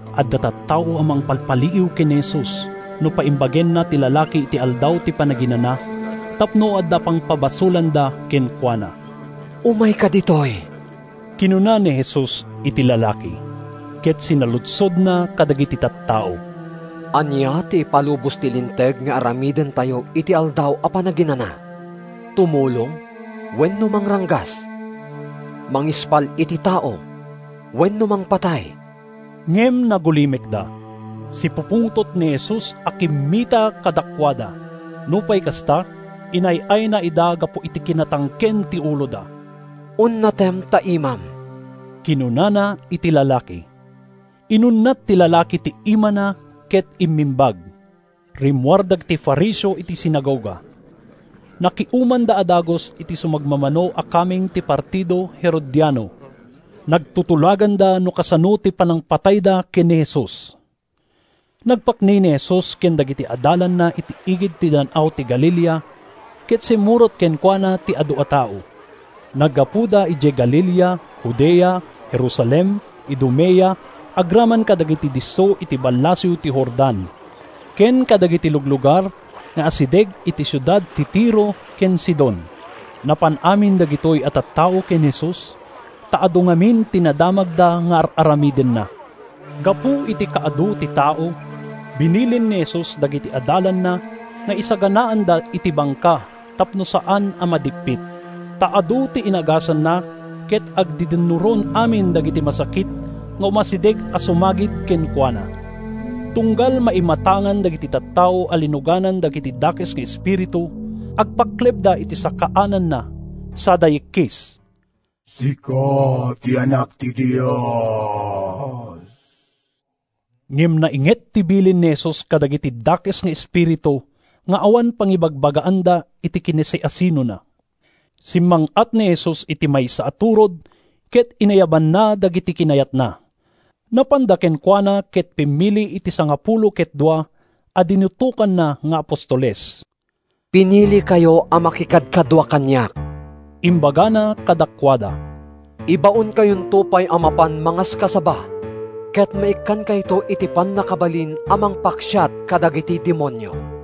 Adda tattao a mangpalpaliiw ken ni Jesus no paimbagenna ti lalaki iti Aldaw ti Panaginana tapno adda pangpabasolanda kenkuana. “Umayka ditoy,” kinuna ni Jesus iti lalaki. Ket sinaludsodna kadagiti tattao: “Ania ti ipalubos ti Linteg nga aramidentayo iti Aldaw a Panaginana? Tumulong wenno mangranggas? Mangispal iti tao wenno mangpatay?” Ngem nagulimekda. Sipupungtot ni Jesus a kimmita kadakuada. Nupay kasta, inay-ayna ida gapu iti kinatangken ti uloda. “Unnatem ta imam,” kinunana iti lalaki. Inunnat ti lalaki ti imana ket immimbag. Rimmuar dagiti Fariseo iti sinagoga. Nakiumanda a dagus iti sumagmamano a kameng ti partido Herodiano. Nagtutulaganda no kasano ti panangpatayda ken ni Jesus. Nagpakni ni Jesus ken dagiti adalanna iti igid ti Dan-aw ti Galilea ket simmurot kenkuana ti adu a tao. Naggapuda idiay Galilea, Judea, Jerusalem, Idumea, agraman kadagiti disso iti ballasiw ti Jordan ken kadagiti luglugar nga asideg iti siudad ti Tiro ken Sidon. Napan amin dagitoy a tattao ken Jesus ta adu ngamin ti nadamagda nga ar-aramidenna. Gapu iti kaadu ti tao, binilin ni Jesus dagiti adalanna nga isaganaanda iti bangka tapno saan a madippit. Ta adu ti inagasanna ket agdidinnuron amin dagiti masakit nga umasideg a sumagid kenkuana. Tunggal maimatangan dagiti tattao a linuganan dagiti dakes nga espiritu, agpaklebda iti sakaananna sada yikkis: “Sika ti Anak ti Dios!” Ngem nainget ti bilin ni Jesus kadagiti dakes nga espiritu nga awan pangibagbagaanda iti kinasiasinona. Simmang-at ni Jesus iti maysa a turod ket inayabanna dagiti kinayatna. Napanda kenkuana ket pimmili iti sangapulo ket dua a dinutokanna nga apostoles. “Pinilikayo a makikadkadua kaniak,” imbagana kadakuada. “Ibaonkayonto pay a mapan mangaskasaba ket maikkankayto iti pannakabalin a mangpaksiat kadagiti demonio.”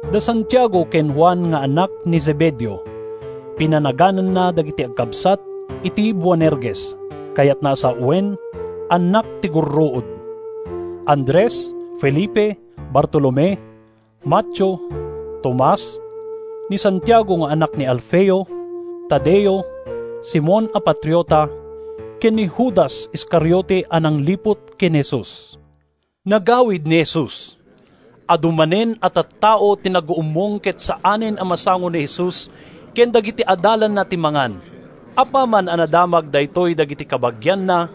da Santiago ken Juan nga annak ni Zebedeo (pinanagananna dagiti agkabsat iti Boanerges, kayatna a sawen, “Annak ti Gurruod”); Andres, Felipe, Bartolome, Mateo, Tomas; ni Santiago nga anak ni Alfeo; Tadeo, Simon a Patriota ken ni Judas Iscariote a nangliput ken Jesus. Nagawid ni Jesus. Adu manen a tattao ti naguummong ket saanen a masango ni Jesus ken dagiti adalanna ti mangan. Apaman a nadamag daytoy dagiti kabagianna,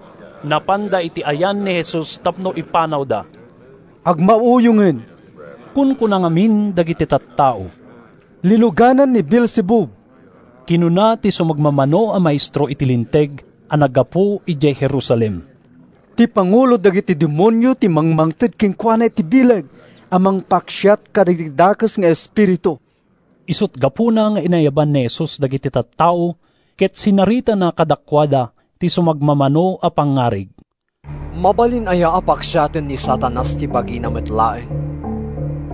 napanda iti ayan ni Jesus tapno ipanawda. “Agmauyongen,” kunkuna ngamin dagiti tattao. “Linuganan ni Beelzebub!” kinuna ti sumagmamano a maestro iti Linteg a naggapu idiay Jerusalem. “Ti pangulo dagiti demonio ti mangmangted kenkuana iti bileg a mangpaksiat kadagiti dakes nga espiritu.” Isut’ gapuna nga inayaban ni Jesus dagiti tattao ket sinaritana kadakuada ti sumagmamano a pangngarig: “Mabalin aya a paksiaten ni Satanas ti bagina met laeng?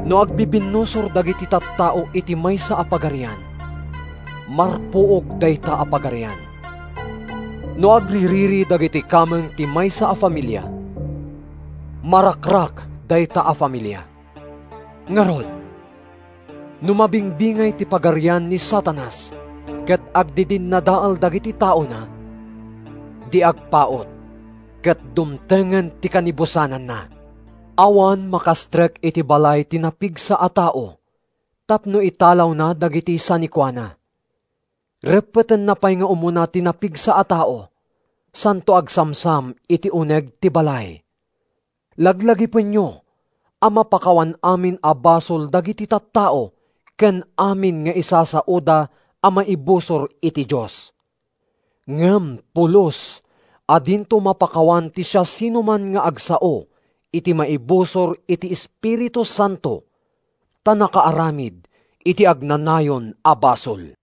No agbibinnusor dagiti tattao iti maysa a pagarian, marpuog dayta a pagarian. No agririri dagiti kameng ti maysa a familia, marakrak dayta a familia. Ngarud, no mabingbingay ti pagarian ni Satanas, ket agdidinnadael dagiti taona, di agpaut ket dumtengen ti kanibusananna. “Awan makastrek iti balay ti napigsa a tao tapno italawna dagiti sanikuana. Reppetenna pay nga umuna ti napigsa a tao santo agsamsam iti uneg ti balay. “Laglagipenyo a mapakawan amin a basol dagiti tattao ken amin nga isasaoda a maibusor iti Dios. Ngem pulos a dinto mapakawan ti siasinoman nga agsao iti maibusor iti Espiritu Santo, ta nakaaramid iti agnanayon a basol.”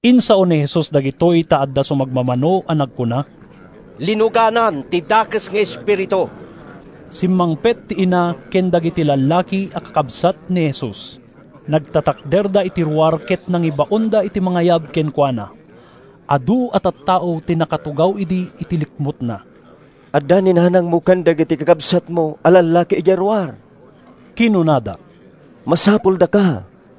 Insao ni Jesus dagitoy ta adda sumagmamano a nagkuna, “Linuganan ti dakes nga espiritu.” Simmangpet ti ina ken dagiti lallaki a kakabsat ni Jesus. Nagtatakderda iti ruar ket nangibaonda iti mangayab kenkuana. Adu a tattao ti nakatugaw idi iti likmutna. “Adda ni nanangmo ken dagiti kakabsatmo a lallaki idiay ruar,” kinunada. “Masapuldaka.”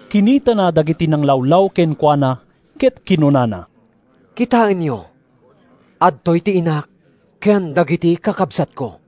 Kinitana dagiti nanglawlaw kenkuana ket kinunana, “Kitaenyo! Adtoy ti inak ken dagiti kakabsatko!